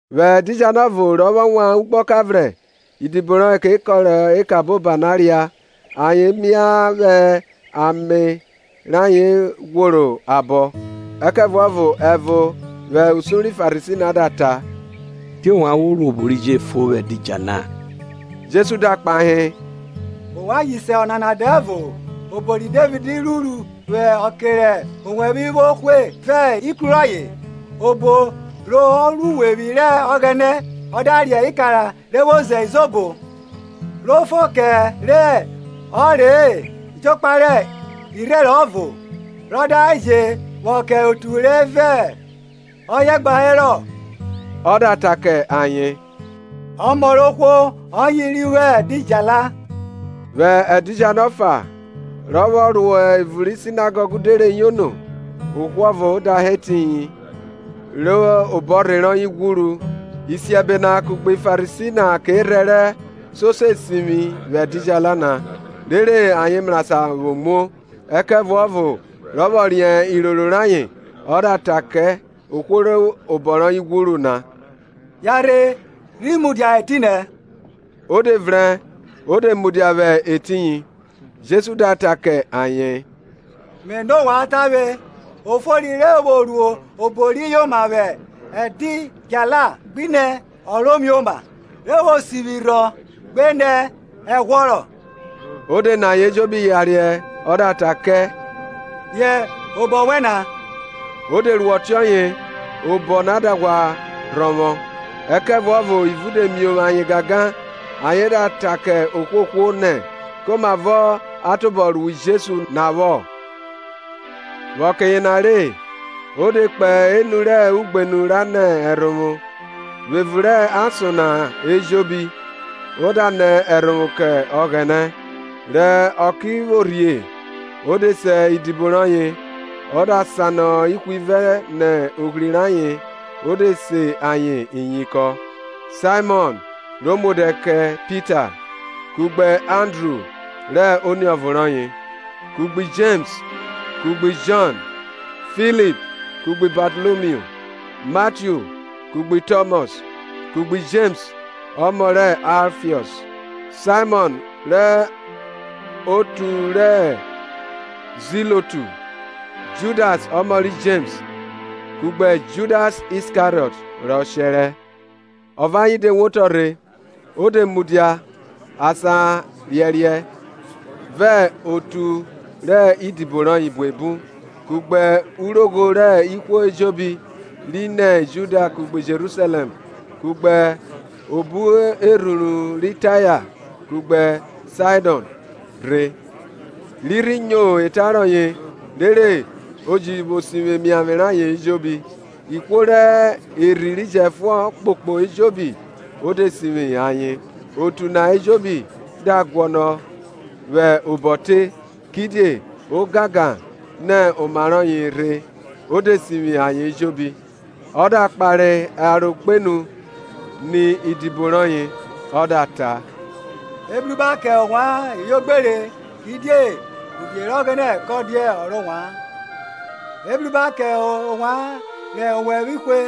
Vwẹ ẹdidjala ọvo, rọ vwọ wan ugbọka vrẹn, idibo rọye ke kọrọ eka eboba na ria, ayen mia vwẹ ame rọye ghworo abo. Ẹkẹvuọvo ẹvo vwẹ usun ri Farisi na da ta, Die ovwan vwo ru obo ri je fo vwẹ ẹdidjala? Jesu da kpahe, Ovwan ji se ọnana dẹvo-o, obo ri Devid ruru vwẹ ọke rẹ owẹvwe vwo hwe, vẹ ikru rọye; obo rọ ro uwevwi rẹ Ọghẹnẹ, ọ da re ikara re vwo ze izobo, ro fo kẹ re ọ re-e jokpa re irherẹn ọvo, rọ da je vwọ kẹ otu re vẹ ọye gba herọ? Ọ da ta kẹ ayen, Ọmọ rẹ ohwo ọye ri vwo ẹdidjala. Vwẹ ẹdidjala ọfa, rọ vwọ ro evun ri Sinagọg de re yono, ohwo ọvo da hẹ etiyin rẹ obọrhe rọye ghwuru. Isiẹbe na kugbe Farisi na ke rhẹrẹ, so se sivwi vwẹ ẹdidjala na, rere ayen mrasan vwo muo. Ẹkẹvuọvo rọ vwọ riẹn iroro rayen, ọ da ta kẹ ohwo rẹ obọ rọye ghwuru na, Yanrhe rhi mudia etinẹ. O de vrẹn o de mudia vwẹ etiyin. Jesu da ta kẹ ayen, Me nọ ovwan tavwe, o fori re vwo ru obo ri yoma vwẹ ẹdidjala ghinẹ ọ ro mioma? re vwo sivwi rhọ gbenẹ ẹghwọrọ? O di ni ayen ejobi yariẹ, ọ da ta kẹ, Riẹn obọ wẹn na. O de ru ọtiọye, obọ na da ghwa rhọvwọ. Ẹkẹvuọvo ivun de miovwo ayen gangan, ayen da ta kẹ ohwohwo nẹ komavo a tobọ rui Jesu na vwọ. Vwẹ ọke yena re, o de kpo enu rẹ ugbenu ra nẹ ẹrhovwo; vwẹ evun rẹ ason na ejobi ọ da nẹ ẹrhovwo kẹ Ọghẹnẹ. Rẹ ọke rhi vwo rhie, o de se idibo rọye, ọ da sanọ ihwivẹ nẹ ohri rẹ ayen o de se ayen iyinkọn; Saimọn, ro mu odẹ kẹ Pita, kugbe Andru rẹ oniọvo rọye, kugbe Jems kugbe Jọn, Filip kugbe Batalomiu, Matiu kugbe Tọmọs kugbe Jems ọmọ rẹ Aifiọs, Saimọn ọ rẹ oru ri Ziiotu, Judas ọmọ ri Jems kugbe Judas Iskariọt rọ shẹrẹ. Ọ vẹ ayen de wotọ rhe o de mudia asan riẹriẹ, vẹ otu rẹ idibo rọye buebu kugbe urogho rẹ ihwo ejobi ri nẹ Judia kugbe Jerusalẹm kugbe obo erhuru ri Taya kugbe Saidọn rhe, ri rhi nyo ota rọye rere o ji sivwi emiavwe rayen ejobi; ihwo rẹ erhi ri jẹfuọn kpokpo ejobi o de sivwi ayen. Otu na ejobi da guọnọ vwẹ obọ te, kidie ogangan nẹ oma rọye rhe o de sivwi ayen ejobi. Ọ da kpare aro kpenu ni idibo rọye, ọ da ta: Ebruba kẹ ovwan ivwiogbere, kidie uvie rẹ Ọghẹnẹ kọ dia ọ rẹ ovwan. Ebruba kẹ ovwan rẹ owẹvwe hwe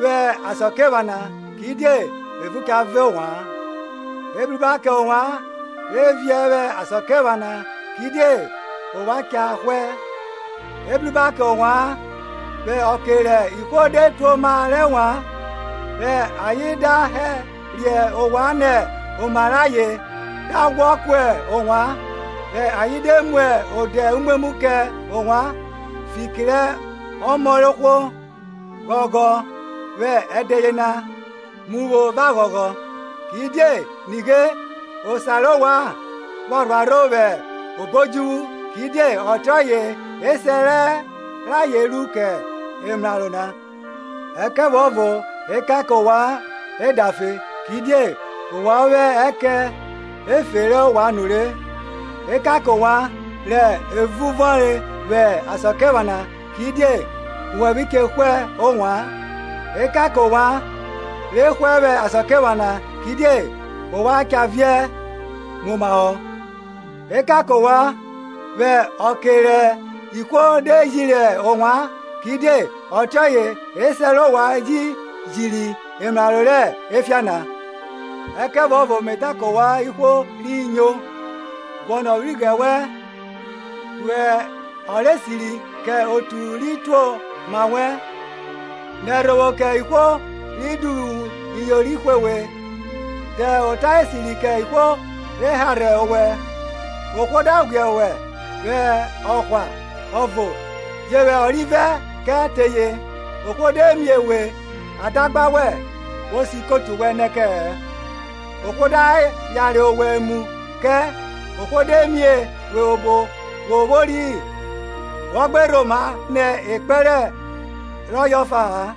vwẹ asakiephana, kidie evun cha vọn ovwan. Ebruba kẹ ovwan re viẹ vwẹ asakiephana, kidie ovwan cha hwẹ. Ebruba kẹ ovwan vwẹ ọke rẹ ihwo de tuoma rẹ ovwan, rẹ ayen da hẹriẹ ovwan nẹ oma re ayen da ghwọ ku ovwan, rẹ ayen de mu odẹ umwemwu kẹ ovwan, fiki rẹ Ọmọ rẹ ohwo! Ghọghọ vwẹ ẹdẹ yena, mu pho vẹ aghọghọ, kidie nighe, osa rẹ ovwan pha rhuarho vwẹ obo odjuvwu; kidie ọtiọye esẹ rayen ru kẹ emraro na. Ẹkẹvuọvo ekan kẹ ovwan edafe, kidie ovwan vwo ẹkẹn efe rẹ ovwan nure. Ekan kẹ ovwan, rẹ evun vọnre vwẹ asakiephana, kidie owẹvwe che hwe ovwan. Ekan kẹ ovwan, re hwẹ vwẹ asakiephana, kidie ovwan cha viẹ muomahọ. Ekan kẹ ovwan, vwẹ ọke rẹ ihwo de jiri ovwan, kidie ọtiọye esẹ rẹ ovwan ji jiri emraro rẹ efian na. Ẹkẹvuọvo me ta kẹ ovwan ihwo ri nyo, Guọnọ ivwighrẹ wẹn, ru ọ rẹ esiri kẹ otu ri tuoma wẹn, Nẹ ẹrhovwo kẹ ihwo ri duvwu iyori hwe we, ta ota esiti kẹ ihwo re harhe owẹ. Ohwo da ghwiẹ wẹ ọhwa ọvo, je vwẹ ọrivẹ kẹ teye; ohwo de mie we adagba wẹn, wo siẹ ikotu wẹn nẹ kẹ-ẹ. Ohwo da yare owẹ emu kẹ, ohwo de mie we obo wo vwori wọ gbe rhoma nọ ekpẹn rọye ọfa-a.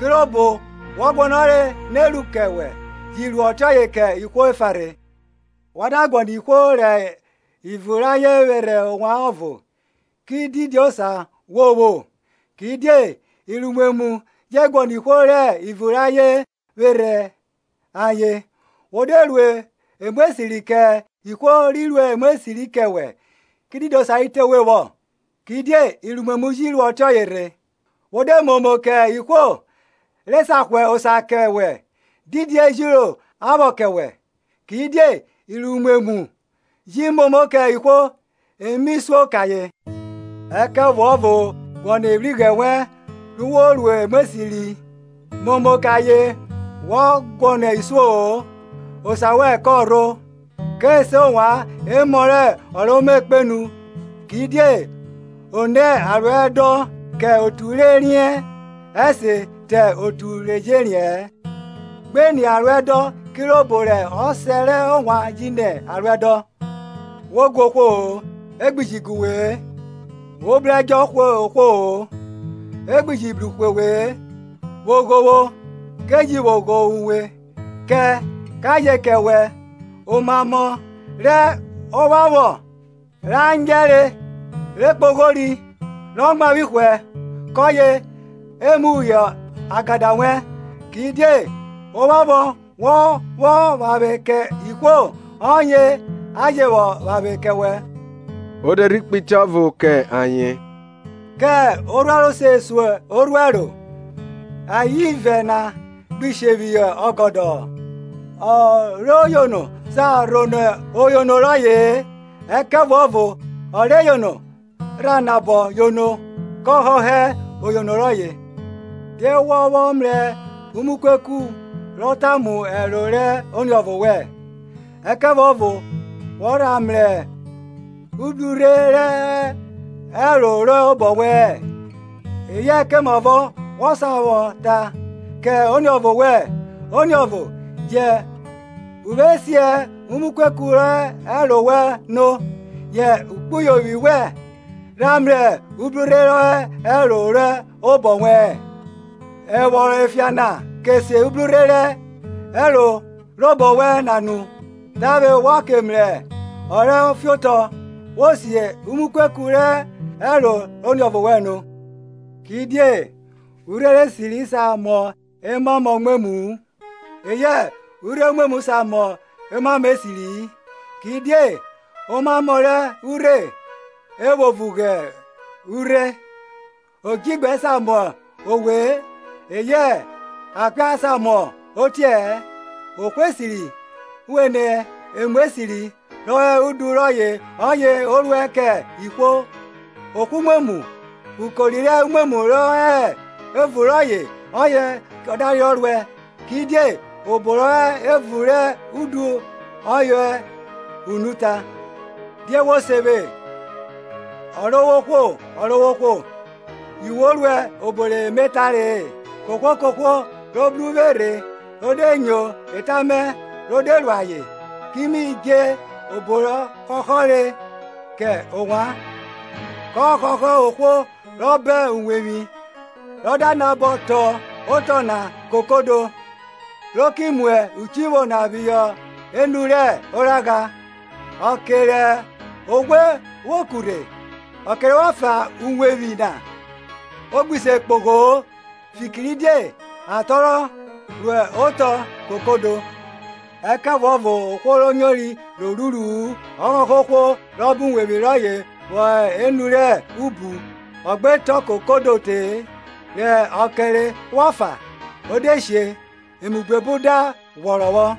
kirobo wọ guọnọre ne ru kẹ wẹ, ji ru ọtiọye kẹ ihwo efa rhe. Wọ da guọnọ ihwo rẹ ivun rẹ ayen vwerhe owẹ ọvo, ki didi osa wo vwo? Kidie iruimwemwn je guọnọ ihwo rẹ ivun rẹ ayen vwerhe ayen. Wo de ru emu esiri kẹ ihwo ri ru emu esiri kẹ wẹ, ki didi osa ri te we vwọ? Kidie iruimwemwu ji ru ọtiọye rhe. Wo de momo kẹ ihwo re sa hwa osa kẹ wẹ, didi ejiro a vwọ kẹ wẹ? Kidie iruimwemwu ji momo kẹ ihwo e mi suo kẹ ayen. Ẹkẹvuọvo guọnọ ivwighrẹ wẹn, ru wo ru emu esiri, momo kẹ ayen wọ guọnọ isuo-o; osa wẹn kọ rho, ke se ovwan emọ rẹ ọ Ro Me Kpenu; kidie o nẹ aruẹdọn kẹ otu re riẹn ẹse te otu ri jẹ riẹn. Gbe ni aruẹdọn kirobo rẹ Ọsẹ rẹ ovwan ji ni aruẹdọn. Wo guẹ ohwo-o e gbi ji gu we-e; Wo bru ẹdjo hwe ohwo-o, e gbi ji bru hwe we-e; vwo ghovwo, ke ji vwo ghovwo uwe; Kẹ, ka je kẹ wẹ; omamọ rẹ ovwanvwọn, ra nyẹre, re kpoghori, rọ mwavwi hwẹ, kọye e mu phihọ agada wẹn. Kidie ovwanvwọn wọ vwọ vwanvwe kẹ ihwo ọye a je vwọ vwanvwe kẹ wẹ. O de rhe kpe itẹ ọvo kẹ ayen; Kẹ orhuẹro se sun orhuẹro? Ayen ivẹ na gbi she phihọ ọgọdọ-ọ. Ọ re yono sa rhonọ oyono rọye-e, ẹkẹvuọvo ọ re yono ra nabọ yono kọ họhọ oyono rọye. Die wọ vwọ mrẹ umukueku ro tamu ẹro rẹ oniọvo wẹn, ẹkẹvuọvo, wọ rha mrẹ ubrurhe rọ hẹ ẹro robọ wẹ-ẹn? Eyẹ komavọ wo sa vwọ ta kẹ oniọvo wẹn, Oniọvo, jẹn uvwe si umukueku rọ hẹ ẹro wẹn no, yẹ ekpuyovwi wẹn rha mrẹ ubrurhe rọ hẹ ẹro robọ wẹ-ẹn? Evwọrọn efian na, ke si ubrurhe rọ hẹ ẹro robọ wẹn na no, tavwe wọ ke mrẹ orẹ fiotọ vwo si umukueku rọ hẹ ẹro rẹ oniọvo wẹn no. Kidie urhe esiri sa mọ omamọ umwemwu-u; eyẹ urhe umwemwu sa mọ omamo esiri-i; Kidie omamo rẹ urhe e vwo vugbe urhẹ. Odjigbẹ sa mọ owẹ-ẹ, eyẹ akpia sa mọ otiẹ-ẹ. Ohwo esiri vwenẹ emu esiri rọ hẹ udu rọye ọye o ruẹ kẹ ihwo, ohwo umwemwu ukori rẹ umwemwu rọ hẹ evun rọye oyẹ ọ da reyọ ruẹ kidie obo rọ hẹ evun rẹ udu ọye unu ta. Die we vwo se vwe, Ọrovwohwo, Ọrovwohwo, yu we ruẹ obo re me tare-e? Kohwo kohwo ro bru uvwe rhe ro de nyo eta mẹ ro de ru ayen, ki mi dje obo rọ họhọre kẹ ovwan. Kọ họhọ ohwo rọ bọn uwevwi, rọ da nabọ tọn otọ na kokodo, ro ki mu uchivwo na phihọ enu rẹ oragha; ọke rẹ oghwe vwo ku rhe, rẹ ọkẹre vwọ fa uwevwi na, o gbi se kpogho-o, fikiridie a tọnrọ ro otọ kokodo. Ẹkẹvuọvo ohwo ro nyori ro ruru-u ọ họhọ ohwo rọ bọn uwevwi rọye vwọ hẹ enu rẹ ubu ọ gbe tọn kodo te-e; rẹ ọkẹre vwọ fa, o de she; emu buebu da ghwọrọ vwọ.